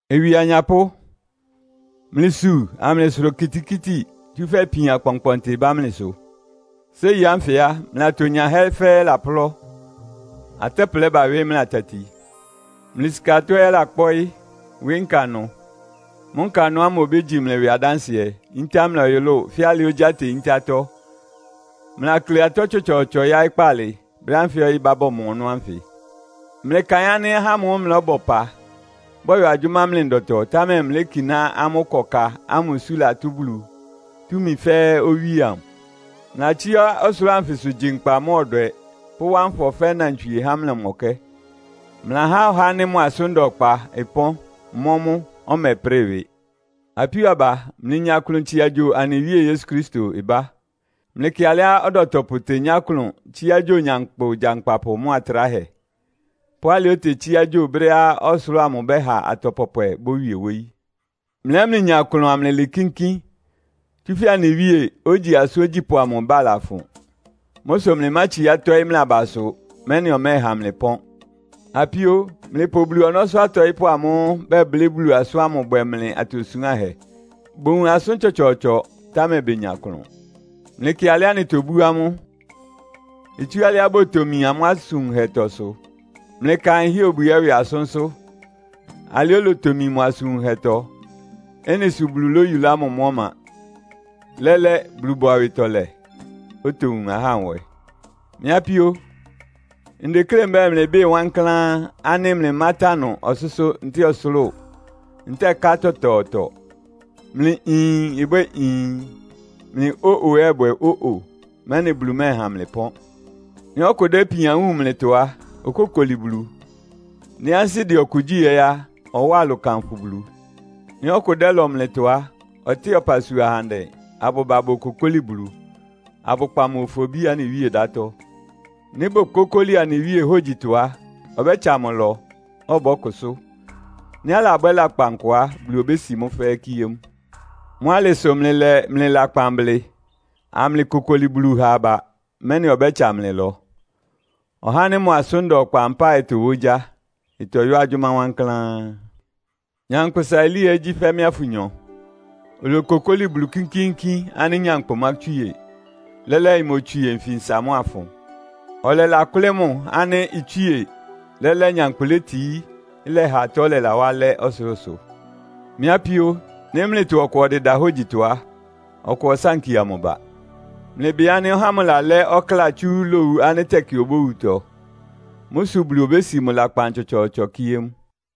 Ɩwɩ anyapʋ́, mlɩsu amlɩsʋra okitikíti, tsúfɛ́ ipian kpɔnkpɔntɩ ɩbá mlɩsʋ. Séi ánfɩ á, mlɩ atonyahɛ́ fɛ́ɛ́ laplɔ́. Atɛ́plɛ bawɩ́ mlɩ atati. Mlɩ sika atɔ́ ɛ́ ɩlakpɔ́ɩ́, wɩ́ nkanʋ. Mʋ́ nkanʋ ámʋ obégyi mlɩ ɩwɩ adánsɩɛ, yíntá mlɩ ɔyʋlʋ́ʋ fɛ́ alɩá ogyá teyíntá atɔ́. Mlɩlakle atɔ́ tsɔtsɔɔtsɔ yáɩ́ kpaalɩ, brɛ́ ánfɩ ɔyɩ́ ɩbá bɔmɔ ɔnɔ́ ánfɩ. Mlɩkaɩn ánɩ́ ahá ámʋ́ʋ́ mlɩlɔ́bɔ ɩpa, bɔyɔ agyʋ́má mlɩ ndɔtɔ, támɛ mlɩlékiná amʋ́ ɩkɔ ka ámʋ isú latʋ́ Bulu, túmi fɛ́ɛ́ Owíe amʋ. Mlɩlatsíá ɔsʋlʋ́ʋ anfɩsʋ, gyi nkpa mʋ́a ɔdwɛ pʋ́wá nfɔ fɛ́ nnantswie há mlɩ ɔmɔkɛ́. Mlɩlahá ɔhá ánɩ́ mʋ asʋ́n da ɔkpa ɩpɔ́n, mɔ́ mʋ, ɔmɛprɩ́ɩ ɩwɩ. Apíó aba, mlɩnya klʋn tsia gyo anɩ Wíe Yesu Kristo ɩbá. Mlɩkɩ alɩá ɔdɔtɔpʋ tenyá klʋn tsíá gyo nyankpʋ gyankpapʋ mʋ́a tráhɛ, pʋ́ alɩá otetsíá gyo brɛ́á ɔsʋlʋ́ʋ amʋ ɩbɛ́ha atɔ pɔpwɛ bówie wóyí. Mlɩ ɛ́ mlɩnya klʋn amlɩlɩɩ kínkín, tsúfɛ́ anɩ Wíe, ogyi asʋ́n ogyípʋ́ amʋ ɩbá lafʋn. Mʋ́ sʋ mlɩmátsiá tɔ́ɩ́ mlɩ abasʋ, mɛ́nɩ ɔmɛ́ɛha mlɩ ɩpɔ́n. Apíó, mlɩpʋ Bulu ɔnɔ́sʋ́ atɔɩ́pʋ́ amʋ́ʋ́ bɛblɩ́ Bulu asʋ́n ámʋ bwɛ mlɩ atosuánhɛ. Bowun asʋ́n tsɔtsɔɔtsɔ, támɛ benya klʋn. Mlɩkɩ alɩá anɩtobú amʋ́. Itsú alɩá botomi amʋ́ asʋn wunhɛtɔ sʋ. Mlɩkaɩn Hiob ɛ́ ɩwɩ asʋ́nsʋ́. Alɩá olotomi mʋ asʋn wunhɛtɔ. Ɩ́nɩ sʋ Bulu lóyulá mʋ mʋ́ ɔma. Lɛ́lɛ́, Bulu bʋ awɩtɔlɛ. Otowun ahá nwɛ. Mɩ́ apíó, ndeklé mbɛ́ɛ mlɩbɩ́ɩ wankláán ánɩ́ mlɩmátánʋ ɔsʋ́sʋ́ ntɛ́ɛ ɔsʋlʋ́ʋ, ntɛ́ɛ ká tɔtɔɔtɔ. Mlɩ “Iin!” ɩbwɛ́ɛ “Iin!” mlɩ “Ó-o!” ɛ́ ɩbwɛ́ɛ “Ó-o!” mɛ́nɩ Bulu mɛ́ɛha mlɩ pɔ́n. Nɩ́ ɔkʋ dɛ́ ipian wúun mlɩtɔ á, okókoli Bulu. Nɩ́ ansɩ́ dɛ ɔkʋ gyí ɛ́ á, ɔwáa ɩlʋ kanfʋ Bulu. Nɩ́ ɔkʋ dɛ́lɔ mlɩtɔ á, ɔtɩ́ɩ ɔpasua ahandɛ abʋba bokokóli Bulu, abʋkpa mʋ ofobí anɩ Wíe ɩdátɔ. Nɩ́ bokókóli anɩ Wíe hógyitɔ á, ɔbɛ́tsa mʋ ɩlɔ, ɔbɔ́kʋsʋ́. Nɩ́ alabwɛ́ lakpan kʋ á, Bulu obési mʋ́ fɛ́ɛ́ kíé mʋ. Mʋ́ alɩ sʋ mlɩlɛ mlɩ lakpan blɩ, amlɩkokoli Bulu ha aba, mɛ́nɩ ɔbɛ́tsa mlɩ ɩlɔ. Ɔhá ánɩ́ mʋ asʋ́n da ɔkpa mpáɩ tɔwá ogyá. Ɩtɔyɔ́ agyʋ́má wankláán. Nyankpʋsa Elia ɛ́ gyí fɛ́ mɩ́a fʋnyɔ. Olokokóli Bulu kínkíínkín ánɩ́ nyankpʋ mátswíe. Lɛ́lɛ́ imotswie nfinsa mʋ́a ɩfʋn. Ɔlɛlakʋ́lɩ́ mʋ ánɩ́ itswíe. Lɛ́lɛ́ nyankpʋ létií, ɩlɛha atɔ́ lɛlawá alɛ́ ɔsʋlʋ́sʋ. Mɩ́ apíó, nɩ́ mlɩtɔ ɔkʋ ɔdɩda hógyitɔ á, ɔkʋ ɔsánkia mʋ ba. Mlɩbɩ ánɩ́ ɔhá ámʋ lalɛ́ ɔkláa tsú lowu ánɩ́ tɛkɩ obówutɔ. Mʋ́ sʋ Bulu obési mʋ lakpan tsɔtsɔɔtsɔ kíé mʋ.